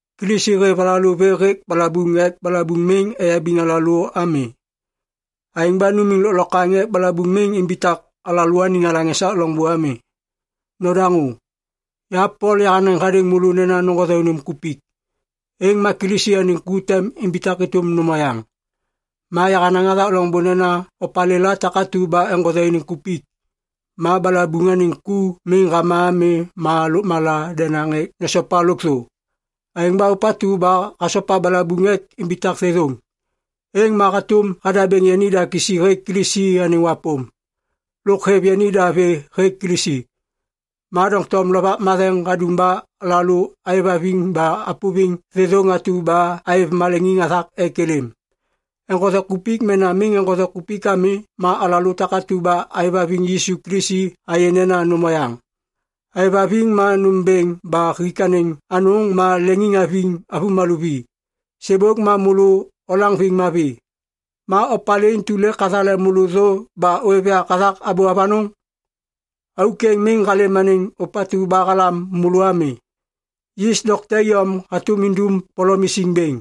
Kilisi hêv alalô vê hêk balabuŋ ek balabuŋ miŋ eyabiŋ alalô ami. Aêŋ ba numiŋ lôklokwaŋ ek balabuŋ miŋ imbitak alalôaniŋ alaŋ esak loŋbô ami. Nodaŋô! Ya Pol yahanaŋ hadêŋ môlô nena noŋgothe unim kupik, êŋ ma Kilisi anêŋ ku tem imbitak êtôm nôm oyaŋ. Ma yahanaŋ hathak loŋbô nena opalêla takatu ba eŋgothe iniŋ kupik, ma balabuŋ anêŋ ku miŋ hama ami ma lôkmala denaŋ ek nesopa lôkthô. Aêŋ ba ôpatu ba hasopa balabuŋ ek imbitak thêthôŋ, êŋ ma hatôm hadabêŋ yanida kisi hêk Kilisi anêŋ wapôm. Lôk hêv yanida vê hêk Kilisi. Ma doŋtom Lovak Matheŋ hadum ba alalô aêvhaviŋ ba apôviŋ thêthôŋ atu ba aêv maleŋiŋ hathak ek êlêm. Eŋgothe kupik mena miŋ eŋgothe kupik ami ma alalô takatu ba aêvhaviŋ Yisu Kilisi ayê nena nôm oyaŋ. Êvhaviŋ ma nômbêŋ ba hik anêŋ anôŋ ma leŋiŋhaviŋ avômalô vi. Sêbôk ma môlô olaŋviŋ mavi. Ma opalê intu lêk hathale môlô thô ba ôêv yak hathak abô avanôŋ? Auk êŋ miŋ halêm anêŋ ôpatu ba halam môlô ami. Yis dokte iyom hatôm idum polom isiŋ bêŋ.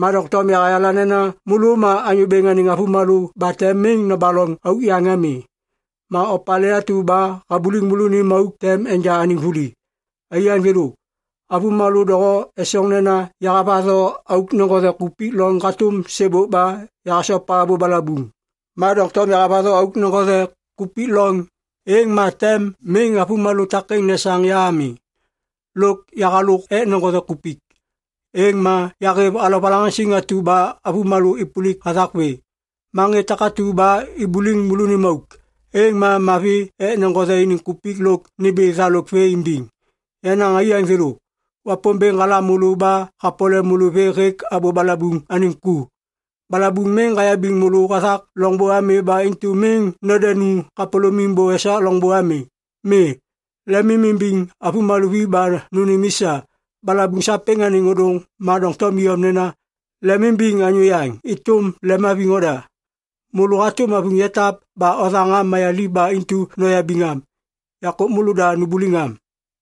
Ma doŋtom yahayala nena môlô ma Anyô Bêŋ anêŋ avômalô ba tem miŋ nobaloŋ auk yaŋ ami. Ma opalê atu ba habuliŋ môlônim auk tem enja anêŋ vuli. Aiyaŋ thêlô, avômalô doho esoŋ nena yahavatho auk neŋgothe kupik loŋ hatôm sêbôk ba yahasopa abô balabuŋ. Ma doŋtom yahavatho auk neŋgothe kupik loŋ, êŋ ma tem miŋ avômalô takêŋ nesaŋ ya ami. Lôk yahalôk ek neŋgothe kupik, êŋ ma yahêv alovalaŋaŋsiŋ atu ba avômalô êpôlik hathak vê. Ma ŋê takatu ba ibuliŋ môlônim auk, êŋ ma mavi ek neŋgothe iniŋ kupik lôk nimbi thalôk vê imbiŋ! Yenaŋ aiyaŋ thêlô, Wapômbêŋ halam môlô ba hapole môlô vê hêk abô balabuŋ anêŋ ku. Balabuŋ miŋ hayabiŋ môlô hathak loŋbô ami ba intu miŋ nodenu kapôlômim bô esak loŋbô ami. Mi. Lemimimbiŋ avômalô vi ba nônêm i sa. Balabuŋ sapêŋ anêŋ ôdôŋ ma doŋtom iyom nena, “Lemimbiŋ anyô yaŋ êtôm lemhaviŋ oda.” Môlô hatôm avuŋ yatap ba othaŋ am mayaliv ba intu noyabiŋ am. Yakô môlôda numbuliŋ am.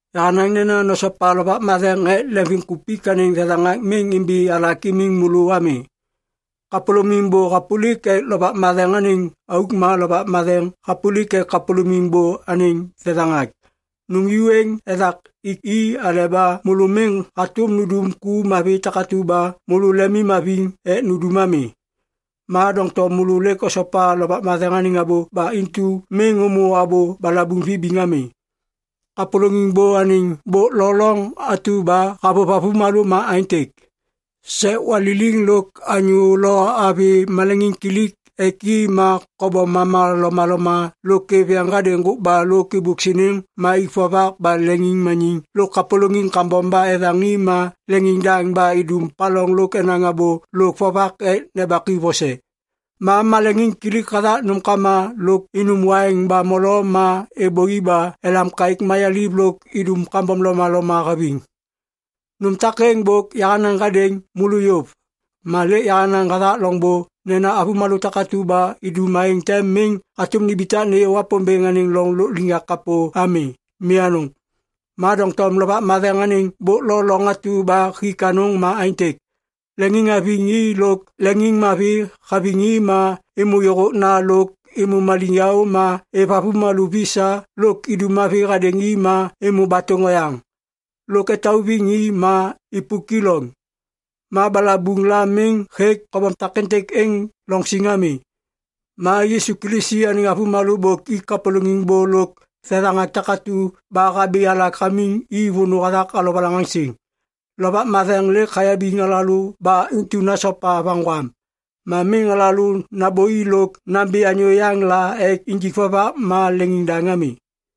Yahanaŋ nena nosopa Lovak Matheŋ ek lemvimkupik anêŋ thethaŋak miŋ imbi alak imiŋ môlô ami. Kapôlôŋiŋ bô hapôlik ek Lovak Matheŋ anêŋ auk ma Lovak Matheŋ hapôlik ek kapôlôŋiŋ bô anêŋ thethaŋak. Nôm ju êŋ ethak ik i aleba môlô miŋ hatôm nundum ku mavi takatu ba môlô lemimhaviŋ ek nundum ami. Ma doŋtom môlô lêk osopa Lovak Matheŋ anêŋ abô ba intu miŋ ômô abô balabuŋ vibiŋ ami. Kapôlôŋiŋ bô anêŋ bôk lo loŋ atu ba havôv avômalô ma aêntêk. Sek waliliŋ lôk anyô lo avi maleŋiŋkilik ek i ma kobom mama lomaloma lôk êv yeŋ hadêŋ ŋgôkba lôk êbôk siniŋ ma ik vovak ba leŋiŋmaniŋ lôk kapôlôŋiŋ kambom ba ethaŋ i ma leŋiŋdaŋ ba idum paloŋ lôk enaŋ abô lôk vovak ek nembak i vose. Ma maleŋiŋkilik hathak nômkama lôk inum waiŋ ba molo ma êbôi ba elam kaêk mayaliv lôk idum kambom lomaloma haviŋ. Nôm takêŋ bôk yahanaŋ hadêŋ môlô yôv, ma lêk yahanaŋ hathak loŋbô nena avômalô takatu ba idum aêŋ tem miŋ hatôm nimbitak nêyô Wapômbêŋ anêŋ loŋ lôkliŋyak kapô ami. Mi anôŋ. Ma doŋtom Lovak Matheŋ anêŋ bôk lo loŋ atu ba hik anôŋ ma aêntêk. Leŋiŋhaviŋ i lôk leŋiŋmavi haviŋ i ma êmô yôhôkna lôk êmô maliŋyaô ma êv avômalô vi sa lôk idum mavi hadêŋ i ma êmô batôŋ oyaŋ lôk etauviŋ i ma ipuki loŋ. Ma balabuŋ la miŋ hêk kobom takêntêk êŋ loŋ siŋ ami. Ma Yisu Kilisi anêŋ avômalô bôk ik kapôlôŋiŋ bô lôk thethaŋak takatu ba habi alak hamiŋ i vônô hathak alovalaŋaŋsiŋ. Lovak Matheŋ lêk hayabiŋ alalô ba intu nasopa vaŋgwam. Ma miŋ alalô nambôi lôk nambi anyô yaŋ la ek injik vovak ma leŋiŋdaŋ ami.